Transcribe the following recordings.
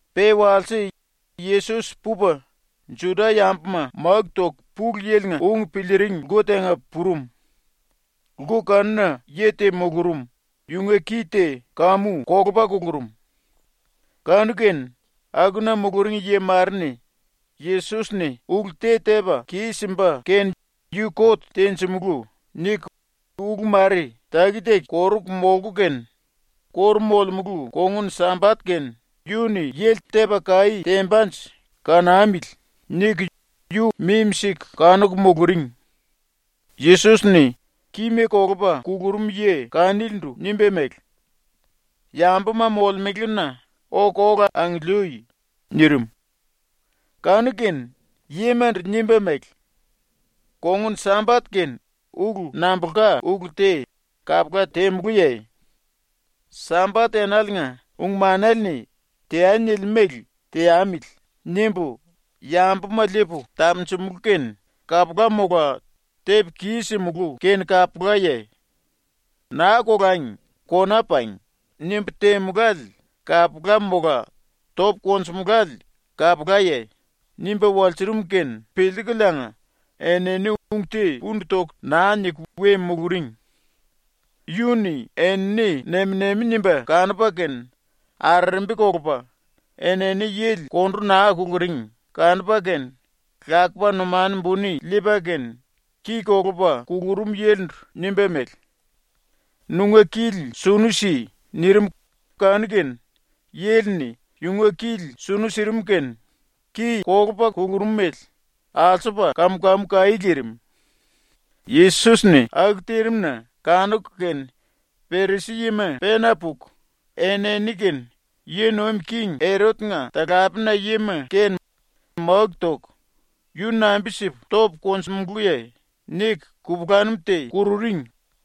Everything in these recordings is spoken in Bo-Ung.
Pe walse Yesos pupa Juda-yambuma máku toku Pulu Yili-nga ung piliiring lku tenga purum. Lku kanuna yi te mulurum, yunga ki te kamu kolupa kukurum. Kanu-kene akuna muluring yi mare-ni ‘Yesos-ni ulu te tepa kis-simba kene yu kot tenjimulú.’ niku ulu mare ⸤taki-taki koruku molku kene⸥ ‘⸤Kóru molemulu⸥ kongun-Sambat kene yu-ni yili tepa kaí tembanje kanamili.’ niku yu mimi-siku kanuku muluring. Yesos-ni kima kolupa kukurum yi kanilindu nimba mele: “Yambuma molemelena oku ola angiliui.” nirim. Kanu-kene yimandu nimba mele: “Kongun-Sambat kene ulu nambulka ulu te kapula temulúye? ‘Sambat enaliinga ung-manele-ni “Teai.” nilimú mele teamili.’ nimbu yambuma liipu tapunjumulú kene kapula mola tepu kis-simulú kene kapulaye? ‘Naa kolangi kona pangi.’ nimbu temulále kapula mola topu konjumulále kapulaye?” nimba walsurum kene piliikuliinga enini ung te pundu toku naa niku we muluring. Yu-ni enini nem-nemi nimba kanupa kene arerembi kolupa enini yili kondu naa kuluring kanupa kene lakupa numanu buni liipa kene ki kolupa kukurum yilindu nimba mele: “Nunga kili sunu si.” nirim kanu-kene yili-ni yunga kili sunu sirim kene ki kolupa kukurumele alsupa kam-kamu kaí lirim. ⸤Yesos-ni aku tirim-na kanuku kene⸥ Perisi-yima pena puku, enini kene yi nuim king Erot-nga talapena yima kene máku toku “Yu nambi-sipu topu konjumulúye?” niku kupulanum te kururing.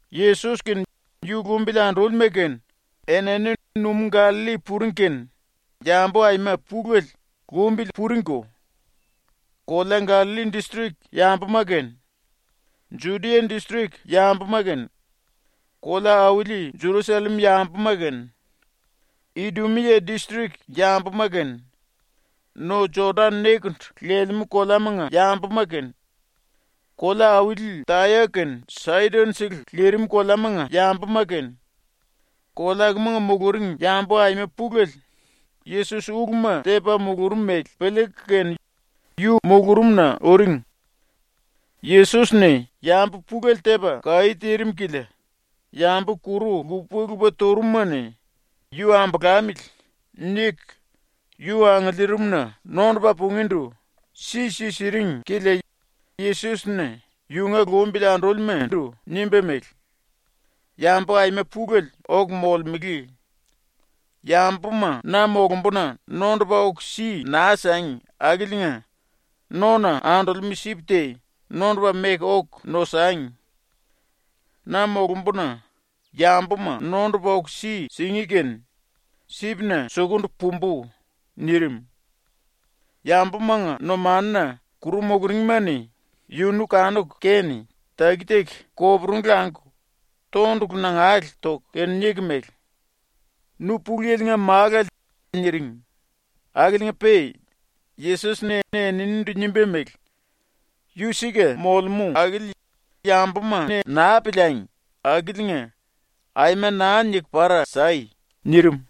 Yesos kene yu lumbili andúlima kene enini numú Gallalli puring kene yambu aima pulele lumbili puringko. Kolea Gallalli distrik yambuma kene, Judia distrik yambuma kene, kolea-auli Jerusallem yambuma kene, Idumia distrik yambuma kene, no Jodan nekendu lelemú koleamanga yambuma kene, kolea-auli Taya kene Saidon-sele lirim koleamanga yambuma kene, kolea akumanga muluring yambu aima pulele Yesos uluma tepa mulurum mele piliiku kene yu mulurumna uring. Yesos-ni yambu pulele tepa kaí tirim kilia yambu kuru lupa-lupa turumuma-ni ‘Yu ambolamili.’ niku yu angiliirimna nondupa pungíndu si-si siring kilia Yesos-ni yunga lumbili andúlimandu nimba mele: “Yambu aima pulele oku molemele. Yambuma na molumbuna nondupa oku si naa sangi akiliinga nona andolemú sip te nondupa meku oku nosangi. Na molumbuna yambuma nondupa oku si singí kene sipna sukundu pumbu.” nirim. ⸤Yambumanga numanuna⸥ kuru muluringma-ni yunu kanuku kene taki-taki koporungu languku tondulu nangale toku kene niku mele: “Nu Pulu Yili-nga Málale.” niring, akiliinga-pe Yesos-ni eninindu nimba mele: “Yu ⸤sika⸥ molemú akili ⸤yambuma-ni naa piliangi akiliinga⸥ aima naa niku para sai!” nirim.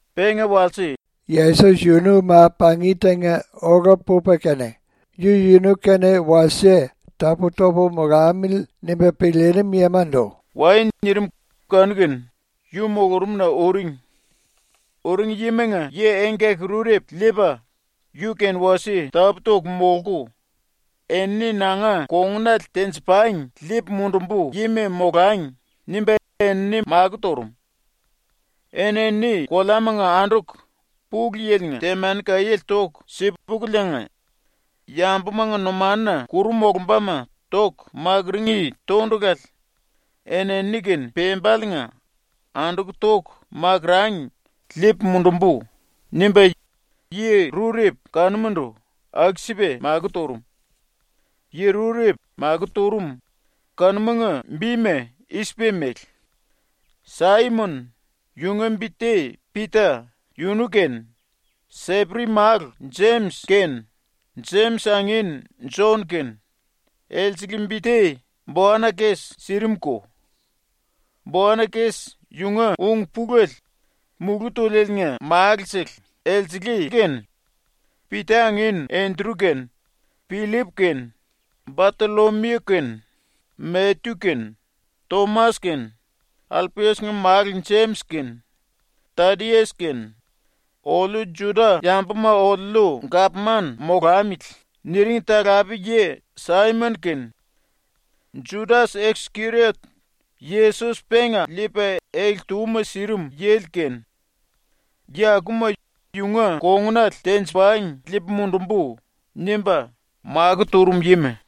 ⸤Penga walse⸥ Yesos yunu ma-pangi tenga ola pupa kene ‘yu-yunu kene wasie tapú-topu molamili.’ nimba piliirim yimandu “Wai.” nirim kanu-kene yu mulurumna uring. Uring yimanga yi engkaki-rurepu liipa, yu kene wasie tapú-toku molku, “Enini nanga kongunale tenji-pangi liipu mundumbu yima molangi.” nimba enini makó turum. ‘Enini koleamanga anduku Pulu Yili-nga temani kaiéle toku si-pukuliinga, yambumanga numanuna kuru molombama toku makurungí tondulale enini-kene pembaliinga anduku toku makurangi liipu mundumbu.’ nimba yi rurepu kanumandu aku-sipa makó turum. Yi rurepu makó turum kanumanga bima i-sipa mele: Saimon (yunga bi te Pita) yunu kene, Seperi málu Jemis kene, Jemis angin Jon kene, (elsele bi te Boanakes sirimuko. Boanakes yunga ung-pulele Mulú Túlieliinga Málu-sele), elsele kene, ⸤Pita angin⸥ Endru kene, Pillip kene, Batollomiu kene, Matyu kene, Tomas kene, Alpias-nga málu Jemis kene, Tadias kene, “Oliu Juda-yambuma oliuliu gapman molamili.” niring talape-yi Saimon kene, Judas-Iskeriot, Yesos penga liipa ele-túma sirim yili kene, ⸤yi akuma ‘yunga kongunale tenji-pangi liipu mundumbu.’ nimba makó turum yima⸥.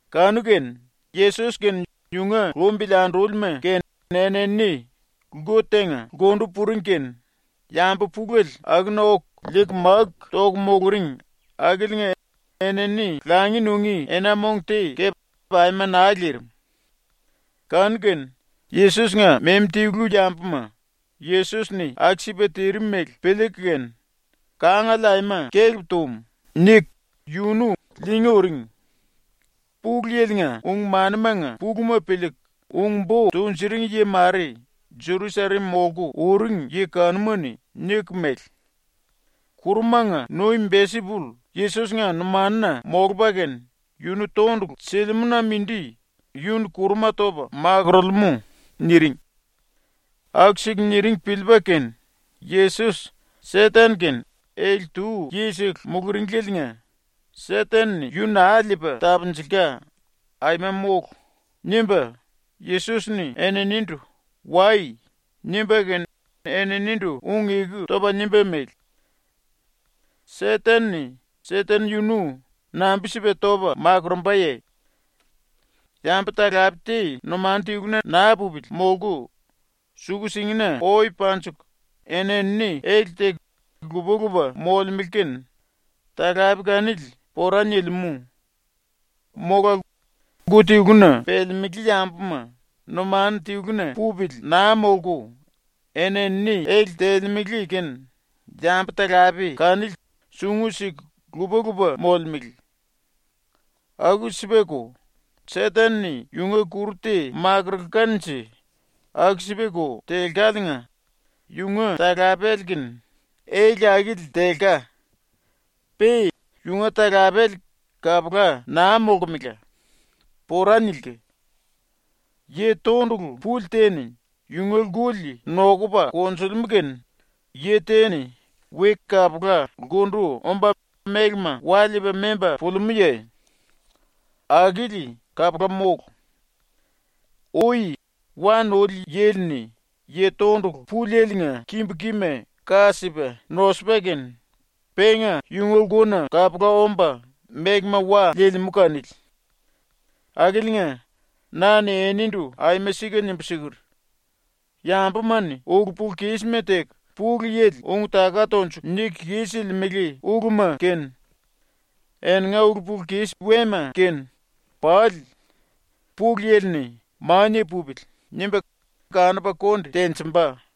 Kanu-kene Yesos kene yunga lumbili andúlima kene enini lku tenga lkundu puring kene yambu pulele akuna oku liiku máku toku muluring akiliinga enini langi nungí ena-mong te kepe aima naa lirim. Kanu-kene Yesos-nga memi-tilu yambuma ⸤Yesos-ni aku-sipa tirim mele⸥ piliiku kene “Kangale aima kelep tum.” niku yunu liingí uring. Pulu Yili-nga ung-manimanga puluma piliiku ung-bo tunjuring yi mare Jerusallem molku uring yi kanuma-ni niku mele: “Kurumanga nuim Belsipull Yesos-nga numanuna molupa kene yunu tondulu silimú-na mindi yu-ni kuruma topa makorolemú.” niring. Aku-siku niring piliipa kene ⸤Yesos Seten-kene ele-tu yisele muluringlieliinga ‘Seten-ni yu naa liipa tapunjulka aima mólu!’ nimba⸥ Yesos-ni eninindu “Wai.” nimba kene eninindu ung-eku topa nimba mele: “Seten-ni Seten yunu nambi-sipa topa makurumbaye? Yambu-talape te numanu tiluna naa pupili molku suku-singina oe panjiku eni-enini ele teku lupa-lupa molemele kene talape kanili pora nilimú. ⸤Mola⸥ lku tiluna pelemelé yambuma numanu tiluna pupili naa molku eni-enini ele telemele kene yambu-talape kanili sungu siku lupa-lupa molemele. Aku-sipako, Seten-ni yunga kuru te makurulkanje aku-sipako telkaliinga yunga talapele kene ele akili telka. Pe yunga talapele kapula naa molkemela. Pora nilka. “Yi tondulu puli te-ni yunga lkuli nokupa konjulimú kene yi te-ni we kapula lkundu omba mélema wa liipa memba pulimúye? Akili kapula mólu. Ui wa nuli yili-ni yi tondulu pulieliinga kimbu kima ka sipa nosupa kene penga yunga lkuna kapula omba mélema wa liilimú kanili. “⸤Akiliinga⸥ na-ni enindu aima sika nimbu siker: “Yambuma-ni ulu-pulu-kisma teku ⸤Pulu Yili⸥ ung-taka tonjuku niku kis-silimele uluma kene, eninga ulu-pulu-kis wema kene pali ⸤Pulu Yili-ni⸥ ‘Mania pupili.’ nimba kanupa konde tenjimba.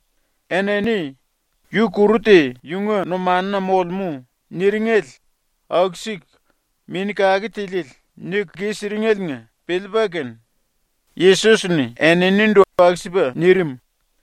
Enini “Yu kuru te yunga numanuna molemú.” niringele ⸤aku-siku Mini Kake Tiliele niku kis-siringeliinga piliipa kene⸥ Yesos-ni eninindu aku-sipa nirim.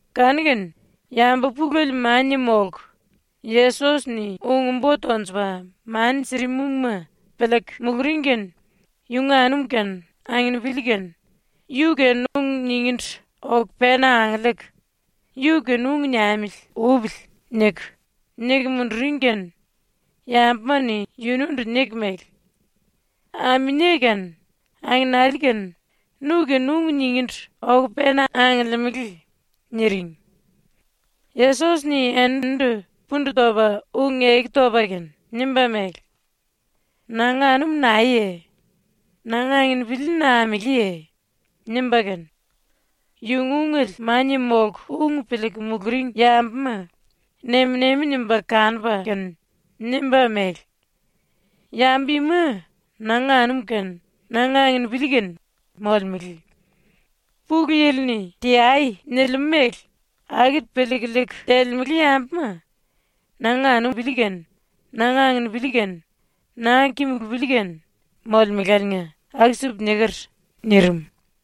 Kanu-kene yambu pulele mania ⸤molku⸥ Yesos-ni ⸤ung-bo tonjupa mani sirim ungma piliiku⸥ muluring kene yunga anum kene anginipili kene yu-kene ung ningíndu oku pena angiliiku “Yu-kene ung niamili upili.” niku, niku munduring kene yambuma-ni yunundu niku mele: “Aminie kene angenali kene nu-kene ung ningíndu oku pena angiliimili.” niring. Yesos-ni eninindu pundu topa ⸤ung-eku topa kene⸥ nimba mele: “Nanga anum naeye? Nanga anginipili nameléye?” nimba kene, yunga ungele mania molku ung piliiku muluring yambuma nem-nemi nimba kanupa kene nimba mele: “Yambu ima nanga anum kene nanga anginipili kene molemele. Pulu Yili-ni “Teai” nilimú mele akili piliiku liiku telemele yambuma nanga anum kene nanga anginipili kene nanga kimulupili kene molemeláliinga aku-sipu niker.” nirim.